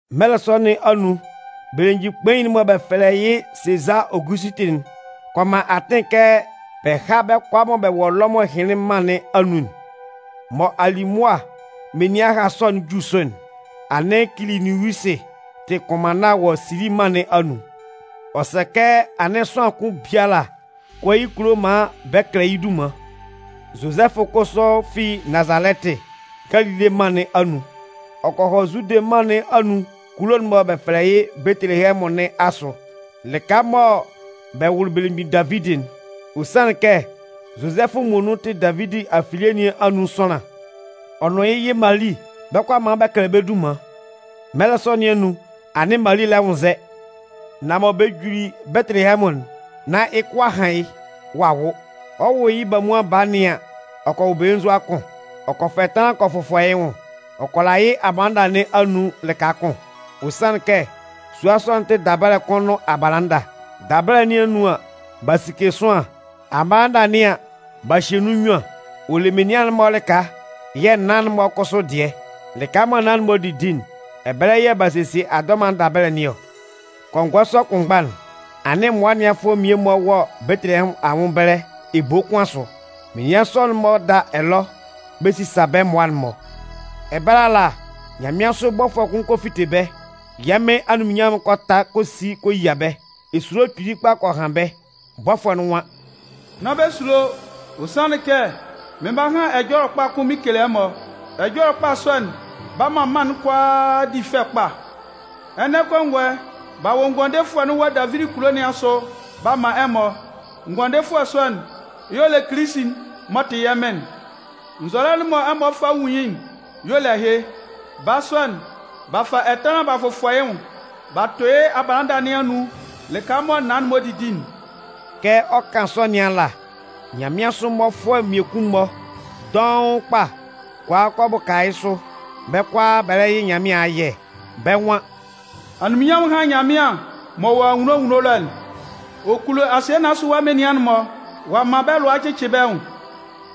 Mɛlɛ sɔ nɩn anun, belemgbin kpain'n mɔ bɛ fɛlɛ yɩ́ Sezaa Ogusɩtɩ'n kɔ man atɩn kɛ bɛ há bɛ́ kʋalaa mɔ bɛ wɔ Lɔmʋn ɛhɩnlɩn mân nɩn anun'n. Mɔ alimʋa menian ɛha sɔ'n 'ju sʋ'n, anɩn Kiliniusɩ tɩ kʋnmanna wɔ Sili mân nɩn anun. Ɔ sɛ kɛ anɩn sʋanlan kʋn biala kɔ yɩ́ kulo maan bɛ kɛlɛ yɩ́ dunman. Zozɛfʋ kʋsʋ fi Nazalɛtɩ, Galile mân nɩn anun, ɔ kɔ hɔ Zude mân nɩn anun kulo'n mɔ bɛ fɛlɛ yɩ́ Betelehɛmʋn nɩn asʋ, lɩka mɔ bɛ wʋlɩ belemgbin Davidi'n. Ɔ sanlɩn kɛ Zozɛfʋ muonun tɩ Davidi afilie nɩn anun sʋanlan. Ɔ nʋn yɩ́ yɩ Mali bɛ 'kɔ a man bɛ kɛlɛ bɛ́ dunman. Mɛlɛ sɔ nɩn anun, anɩn Mali lɛ nwʋnnzɛ. Nan mɔ bɛ juli Betelehɛmʋn'n, nán yɩ́ kʋ a han yɩ́, ɔ'a wʋ. Ɔ 'wʋ yɩ́ bamuan baa nɩn an, ɔ kɔ wʋ belenzua kʋn. Ɔ kɔ fa ɛtanlan kɔ fʋfɔ yɩ́ nwʋn, ɔ kɔ la yɩ́ abalanda nɩn anun lɩka kʋn. Ɔ sanlɩn kɛ sua sɔ'n tɩ dabɛlɛ kʋn nʋn abalanda. Dabɛlɛ nɩn anun an, b'a sike sʋanlan. Abalanda nɩn an, b'a hye nun nnyuan. Ɔ le menian'n-mɔ lɩka yɛ̂ naan'n-mɔ kʋsʋ dɩɛ. Lɩka'n mɔ naan'n-mɔ didi'n, ɛbɛlɛ yɛ̂ b'a sesie adɔman'n dabɛlɛ nɩn ɔ. Kɔngɔɛ sɔ kʋnmgba'n, anɩn mmʋa ɛnɩanfʋɛ mmie-mɔ wɔ Betelehɛmʋn anwʋn ɛbɛlɛ ebo kʋn asʋ. Menian sɔ'n-mɔ da ɛlɔ, bɛ sisa bɛ́ mmʋa'n-mɔ. Ɛbɛlɛ ala, nyanmɩansʋ bɔfʋɛ kʋn kɔ fite bɛ́, yɛ́ Mɩn anunminnyanmʋn'n kɔ ta kɔ si kɔ yia bɛ́. Esulo kpili kpa kɔ han bɛ́. Bɔfʋɛ'n nwan: “Nán bɛ sulo! Ɔ sanlɩn kɛ, mɩn 'ba han ɛjɔlɛ kpa kʋn mɩn kele ɛmɔ. Ɛjɔlɛ kpa sɔ'n 'ba man mân'n kʋalaa di fɛ kpa. Ɛnɛ kɔngɔɛ, b'a wʋ Ngʋandefʋɛ'n wɔ Davidi kulo nɩn asʋ b'a man ɛmɔ. Ngʋandefʋɛ sɔ'n, y'ɔ le Kilisi'n m'ɔ tɩ yɛ́ Mɩn'n. Nzɔlɛ'n mɔ ɛmɔ 'fa bɛ nwun yɩ́'n, y'ɔ le ɛhɩ: Baa sɔ'n, b'a fa ɛtanlan b'a fʋfɔ yɩ́ nwʋn b'a tʋ yɩ́ abalanda nɩn anun lɩka mɔ naan'n-mɔ didi'n.” Kɛ ɔ 'kan sɔ nɩn ala, nyanmɩansʋ mmɔfʋɛ mmiekun-mɔ dɔʋn kpa kɔ a kɔ bʋka yɩ́ sʋ, bɛ́ kʋalaa, bɛ lɛ yɩ Nyanmɩan ayɛ. Bɛ́ nwan: “Anunminnyanmʋn hán Nyanmɩan m'ɔ wɔ anwunno anwunno ɛlɔ'n. Ɔ kulo asɩɛ nɩn asʋ ɛwa menian'n-mɔ. Ɔ'a man bɛ́ lʋa a cɩcɩ bɛ́ nwʋn.”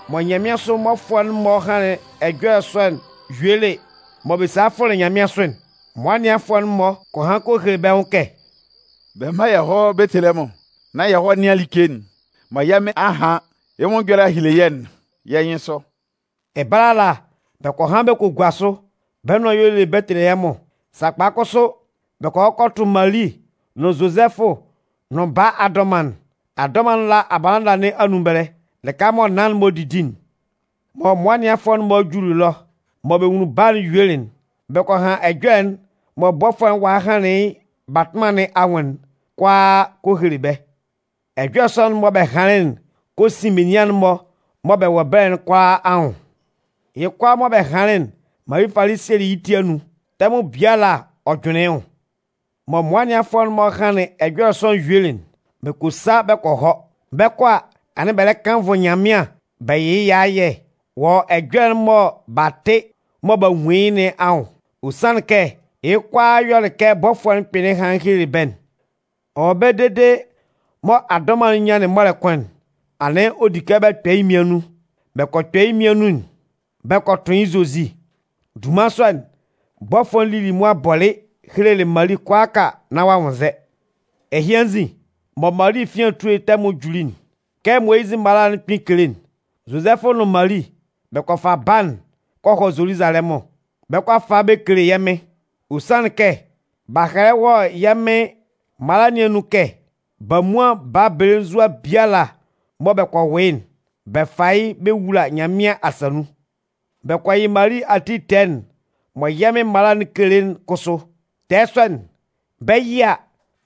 Mɔ nyanmɩansʋ mmɔfʋɛ'n-mɔ hanlɩn ɛjɔlɛ sɔ'n yuelɩ mɔ bɛ salɩ fʋlɩ nyanmɩansʋ'n, mmʋa ɛnɩanfʋɛ'n-mɔ kɔ han kɔ hele bɛ́ nwʋn kɛ: “Bɛ mán yɛ hɔ́ Betelehɛmʋn, nán yɛ hɔ́ nɩ́an like'n mɔ yɛ́ Mɩn a han yɩ́ nwʋn ɛjɔlɛ a hele yɛ́'n yɛ́ nyɩnsʋ.” Ɛbɛlɛ ala, bɛ kɔ han bɛ kɔ gua sʋ, bɛ́ nʋan y'ɔ le Betelehɛmʋn. Sakpa kʋsʋ, bɛ kɔ hɔ kɔ tʋ Mali nʋn Zozɛfʋ nʋn baa adɔman'n. Adɔman'n la abalanda nɩn anun ɛbɛlɛ, lɩka mɔ naan'n-mɔ didi'n. Mɔ mmʋa ɛnɩanfʋɛ'n-mɔ juli ɛlɔ, mɔ bɛ nwunlin baa'n yuelɩ'n, bɛ kɔ han ɛjɔlɛ'n mɔ bɔfʋɛ'n walɩ hanlɩn yɩ́ batʋnman nɩn anwʋn'n kʋalaa kɔ hele bɛ́. Ɛjɔlɛ sɔ'n mɔ bɛ hanlɩn'n kɔ sin menian'n-mɔ mɔ bɛ wɔ ɛbɛlɛ'n kʋalaa anwʋn. Yɩ́ kʋalaa mɔ bɛ hanlɩn'n, Mali falɩ sielɩ yɩ́ ti anun, tɛmʋn biala ɔ jʋnlɩn yɩ́ nwʋn. Mɔ mmʋa ɛnɩanfʋɛ'n-mɔ hanlɩn ɛjɔlɛ sɔ'n yuelɩ'n, bɛ kɔ sa bɛ kɔ hɔ. Bɛ 'kɔ a, anɩn bɛ lɛ kannvʋ Nyanmɩan bɛ yɩ yɩ́ ayɛ wɔ ɛjɔlɛ'n mɔ b'a tɩ mɔ b'a nwun yɩ́ nɩn anwʋn. Ɔ sanlɩn kɛ yɩ́ kʋalaa yɔlɩ kɛ bɔfʋɛ'n kpɩnlɩn hanlɩn helelɩ bɛ́'n. Ɔ wɔ ɛbɛlɛ dede mɔ adɔman'n nyanlɩn mɔlɛ kʋn'n, anɩn ɔ di kɛ bɛ kpɛ yɩ́ mmian nun. Bɛ kɔ kpɛ yɩ́ mmian nun'n bɛ kɔ tʋn yɩ́ Zozi. Dunman sɔ'n, bɔfʋɛ'n lili mʋa bɔlɩ helelɩ Mali kʋalaaka nán ɔ'a nwʋnnzɛ. Ɛhɩ anzin, mɔ Mali efian etue tɛmʋn'n juli'n, kɛ Moyizɩ mala'n kpɩn kele'n, Zozɛfʋ nʋn Mali bɛ kɔ fa baa'n kɔ hɔ Zoluzalɛmʋn. Bɛ 'kɔ a fa yɩ́ bɛ kele yɛ́ Mɩn. Ɔ sanlɩn kɛ b'a hɛlɛ wɔ yɛ́ Mɩn mala nɩn anun kɛ: Bamuan baa belenzua biala mɔ bɛ kɔ wʋ yɩ́'n, bɛ fá yɩ́ bɛ wúla Nyanmɩan asa nun. Bɛ kɔ yɩ Mali ati tɛɛ'n mɔ yɛ́ Mɩn mala'n kele'n kʋsʋ. Tɛɛ sɔ'n, bɛ 'yɩ a,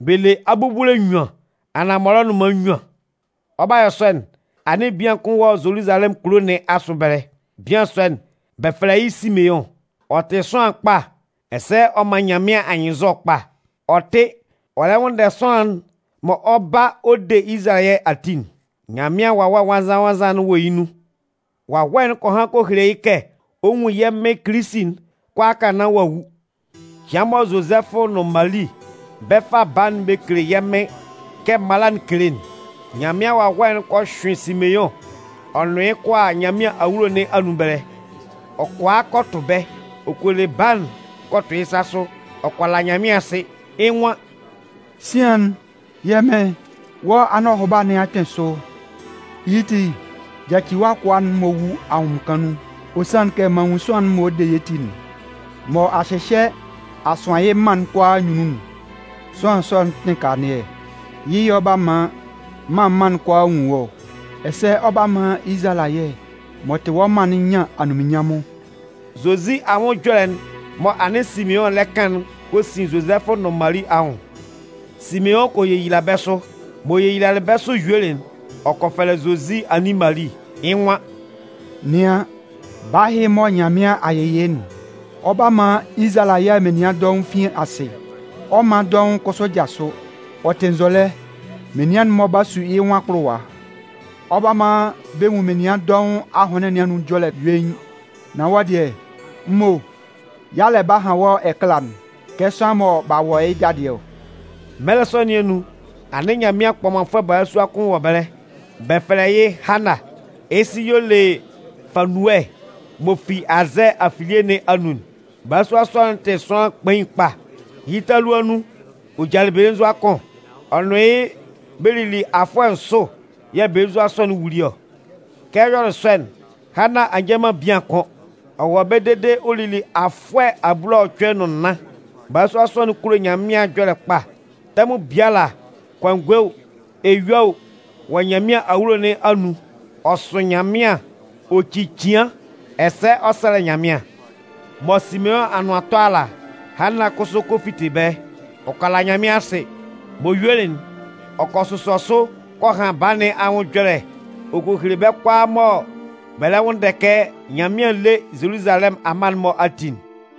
bɛ le abubule nnyuan anaan mɔlɔnʋnman nnyuan. Ɔ 'ba yɔ sɔ'n, anɩn bian kʋn wɔ Zoluzalɛmʋn kulo nɩn asʋ ɛbɛlɛ. Bian sɔ'n, bɛ fɛlɛ yɩ́ Simeʋn. Ɔ tɩ sʋanlan kpa ɛsɛ ɔ man Nyanmɩan anyɩnnzɔ kpa. Ɔ tɩ ɔ lɛ nwʋnndɛ sʋanlan'n mɔ ɔ 'ba ɔ de Izalayɛ ati'n. Nyanmɩan Wawɛ Nwannzan-nwannzan'n wɔ yɩ́ nun. Wawɛ'n kɔ han kɔ hele yɩ́ kɛ ɔ 'nwun yɛ́ Mɩn Kilisi'n kʋalaaka nán ɔ'a wu. Cɩan mɔ Zozɛfʋ nʋn Mali bɛ 'fa baa'n bɛ kele yɛ́ Mɩn kɛ mala'n kele'n, Nyanmɩan Wawɛ'n kɔ hyʋɩn Simeʋn ɔ nʋn yɩ́ kɔ a Nyanmɩan awulo nɩn anun ɛbɛlɛ. Ɔ kɔ a kɔ tʋ bɛ́, ɔ kɔ le baa'n kɔ tʋ yɩ́ sa sʋ, ɔ kɔ la Nyanmɩan asɩ. Yɩ́ nwan: “Sian'n, yɛ́ Mɩn, wɔ́ anɔhʋba nɩn a kpɩn sʋ. Yɩ́ ti, yaci wɔ́ akʋa'n maan ɔ wú ahʋnmɩnkan nun. Ɔ sanlɩn kɛ m'an nwun sʋanlan'n mɔ ɔ 'de yɛ́ ti'n, mɔ a hyɩhyɛ a sʋan yɩ́ mân'n kʋalaa anyunnun'n. Sʋanlan sɔ'n tɩ kanlannɩɛ. Yɩ́ yɛ̂ ɔ 'ba man mân mân'n kʋalaa nwun wɔ́ ɔ. Ɛsɛ ɔ 'ba man Izalayɛ m'ɔ tɩ wɔ́ mân'n nyan anunminnyanmʋn.” Zozi anwʋn ɛjɔlɛ'n mɔ anɩn Simeʋn lɛ kan'n kɔ sin Zozɛfʋ nʋn Mali anwʋn. Simeʋn kɔ yeyila bɛ́ sʋ. M'ɔ yeyilalɩ bɛ́ sʋ yuelɩ'n, ɔ kɔ fɛlɛ Zozi anin Mali, yɩ́ nwan: “Nɩan, baa ɛhɩ mɔ Nyanmɩan a yɩ yɩ́'n, ɔ 'ba man Izalayɛ menian dɔʋn fin asɩ, ɔ 'man dɔʋn kʋsʋ jasʋ. Ɔ tɩ nzɔlɛ, menian'n-mɔ 'ba su yɩ́ nwʋn akpʋlʋwa. Ɔ 'ba man bɛ nwun menian dɔʋn ahʋnlɩn nɩn anun ɛjɔlɛ'n yuein. Nan wɔ́ dɩɛ, m mo, yalɛ 'ba han wɔ́ ɛkala'n kɛ sʋanlan mɔ b'a wɔ yɩ́ dadɩɛ ɔ.” Mɛlɛ sɔ nɩn anun, anɩn Nyanmɩan kpɔmanfʋɛ balasua kʋn wɔ ɛbɛlɛ. Bɛ fɛlɛ yɩ́ Hanna. Yɩ́ sɩ y'ɔ le Fanuɛ m'ɔ fi Azɛɛ afilie nɩn anun'n. Balasua sɔ'n tɩ sʋanlan kpain kpa. Yɩ́ talua nun, ɔ jalɩ belenzua kʋn, ɔ nʋn yɩ́ bɛ lili afʋɛ nsʋ yɛ̂ belenzua sɔ'n wuli ɔ. Kɛ ɔ yɔlɩ sɔ'n, Hanna a nja man bian kʋ́n. Ɔ wɔ ɛbɛlɛ dede ɔ lili afʋɛ abulaɔcʋɛ nʋn nnan. Bala sɔ'n kulo Nyanmɩan ɛjɔlɛ kpa. Tɛmʋn biala, kɔngɔɛ o, eyue o, ɔ wɔ Nyanmɩan awulo nɩn anun ɔ sʋ Nyanmɩan ɔ ci cɩan, ɛsɛ ɔ sɛlɛ Nyanmɩan. Mɔ Simeʋn anʋan 'tɔ ala, Hanna kʋsʋ kɔ fite ɛbɛlɛ. Ɔ kɔ la Nyanmɩan asɩ. M'ɔ yuelɩ'n, ɔ kɔ sʋsɔ sʋ kɔ han baa nɩn anwʋn ɛjɔlɛ ɔ kɔ hele bɛ́ kʋalaa mɔ bɛ lɛ nwʋnndɛ kɛ Nyanmɩan lé Zoluzalɛmʋn amma'n-mɔ ati'n.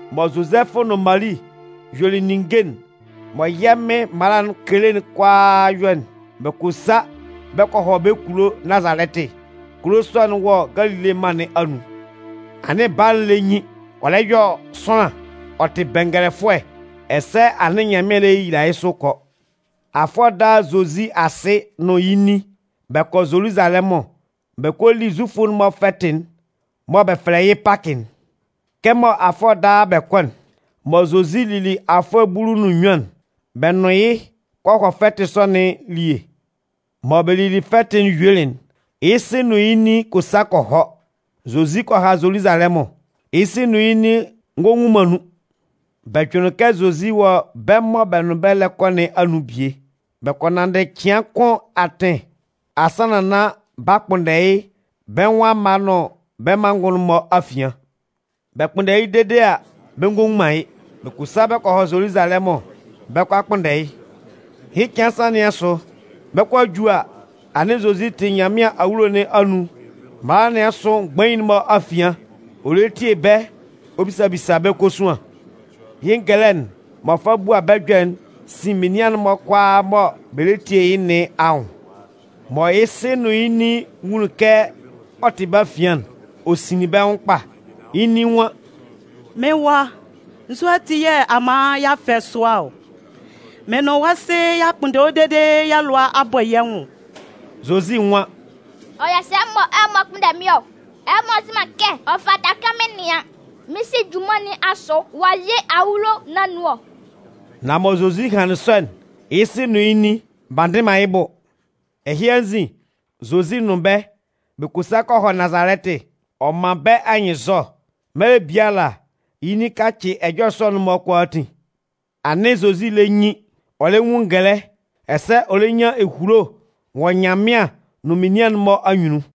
Mɔ Zozɛfʋ nʋn Mali yuelɩ ninnge'n mɔ yɛ́ Mɩn mala'n kele'n kʋalaa yɔ'n, bɛ kɔ sa bɛ kɔ hɔ bɛ́ kulo Nazalɛtɩ. Kulo sɔ'n wɔ Galile mân nɩn anun. Anɩn baa'n lɛ nyin, ɔ lɛ yɔ sʋanlan. Ɔ tɩ bɛngɛlɛfʋɛ ɛsɛ anɩn Nyanmɩan lɛ yeyila yɩ́ sʋ kɔ. Afʋɛ daa Zozi asɩ nɩn yɩ́ nin, bɛ kɔ Zoluzalɛmʋn, bɛ kɔ li Zufʋ'n-mɔ fɛtɩ'n mɔ bɛ fɛlɛ yɩ́ Pakɩ'n. Kɛmɔ afʋɛ daa bɛ kɔ'n, mɔ Zozi lili afʋɛ bulu nʋn nnyuan'n, bɛ nʋn yɩ́ kɔ hɔ fɛtɩ sɔ nɩn elie. Mɔ bɛ lili fɛtɩ'n yuelɩ'n, yɩ́ sɩ nʋn yɩ́ nin kɔ sa kɔ hɔ. Zozi kɔ ha Zoluzalɛmʋn. Yɩ́ sɩ nʋn yɩ́ nin ngɔ nwun man nun. Bɛ jʋnlɩn kɛ Zozi wɔ bɛ́ mɔ bɛ nʋn bɛ́ lɛ kɔ nɩn anun bie. Bɛ kɔ nanndɩ cɩan kʋn atɩn asannan nán b'a kpʋnndɛ yɩ́ bɛ́ nwʋn amma nʋn bɛ́ manngʋn'n-mɔ afian. Bɛ kpʋnndɛlɩ yɩ́ dede a, bɛ ngɔ nwun man yɩ́. Bɛ kɔ sa bɛ kɔ hɔ Zoluzalɛmʋn, bɛ 'kɔ a kpʋnndɛ yɩ́. Yɩ́ cɩan nsan nɩn asʋ, bɛ 'kɔ a ju a, anɩn Zozi tɩ Nyanmɩan awulo nɩn anun mala nɩn asʋ mgbain'n-mɔ afian, ɔ lɛ tie bɛ́ ɔ bisa bisa bɛ́ kosuan. Yɩ́ ngɛlɛ'n m'ɔ fa bua bɛ́ ɛjɔlɛ'n sin menian'n-mɔ kʋalaa mɔ bɛ lɛ tie yɩ́ nɩn anwʋn. Mɔ yɩ́ sɩ nʋn yɩ́ nin nwunlin kɛ ɔ tɩ bɛ́ afian'n, ɔ sinlɩn bɛ́ nwʋn kpa. Yɩ́ nin nwan: “Mɩ́n wa, nzu ati yɛ̂ a man y'a fɛ sʋa ɔ? Mɩ́n nʋn wɔ́ sɩ y'a kpʋnndɛ wɔ́ dede yɛ́ lʋa a bɔ yɛ́ nwʋn.” Zozi nwan: “Ɔ yɔ sɛ mɔ ɛmɔ kpʋnndɛ mɩ́n ɔ? Ɛmɔ nzɩ man kɛ ɔ fata kɛ mɩn nɩan mɩ́n Sɩ junman nɩn asʋ wɔ yɩ́ awulo nɩn anun ɔ?” Nan mɔ Zozi hanlɩn sɔ'n, yɩ́ sɩ nʋn yɩ́ nin, b'a ndɩ man yɩ́ bʋ. Ɛhɩ anzin, Zozi nʋn bɛ́, bɛ kɔ sa kɔ hɔ Nazalɛtɩ. Ɔ man bɛ́ anyɩnnzɔ. Mɛlɛ biala, yɩ́ nin kacɩ ɛjɔlɛ sɔ'n-mɔ kʋalaatin. Anɩn Zozi lɛ nyin, ɔ lɛ nwun ngɛlɛ, ɛsɛ ɔ lɛ nyan ehulo wɔ Nyanmɩan nʋn menian'n-mɔ anyunnun.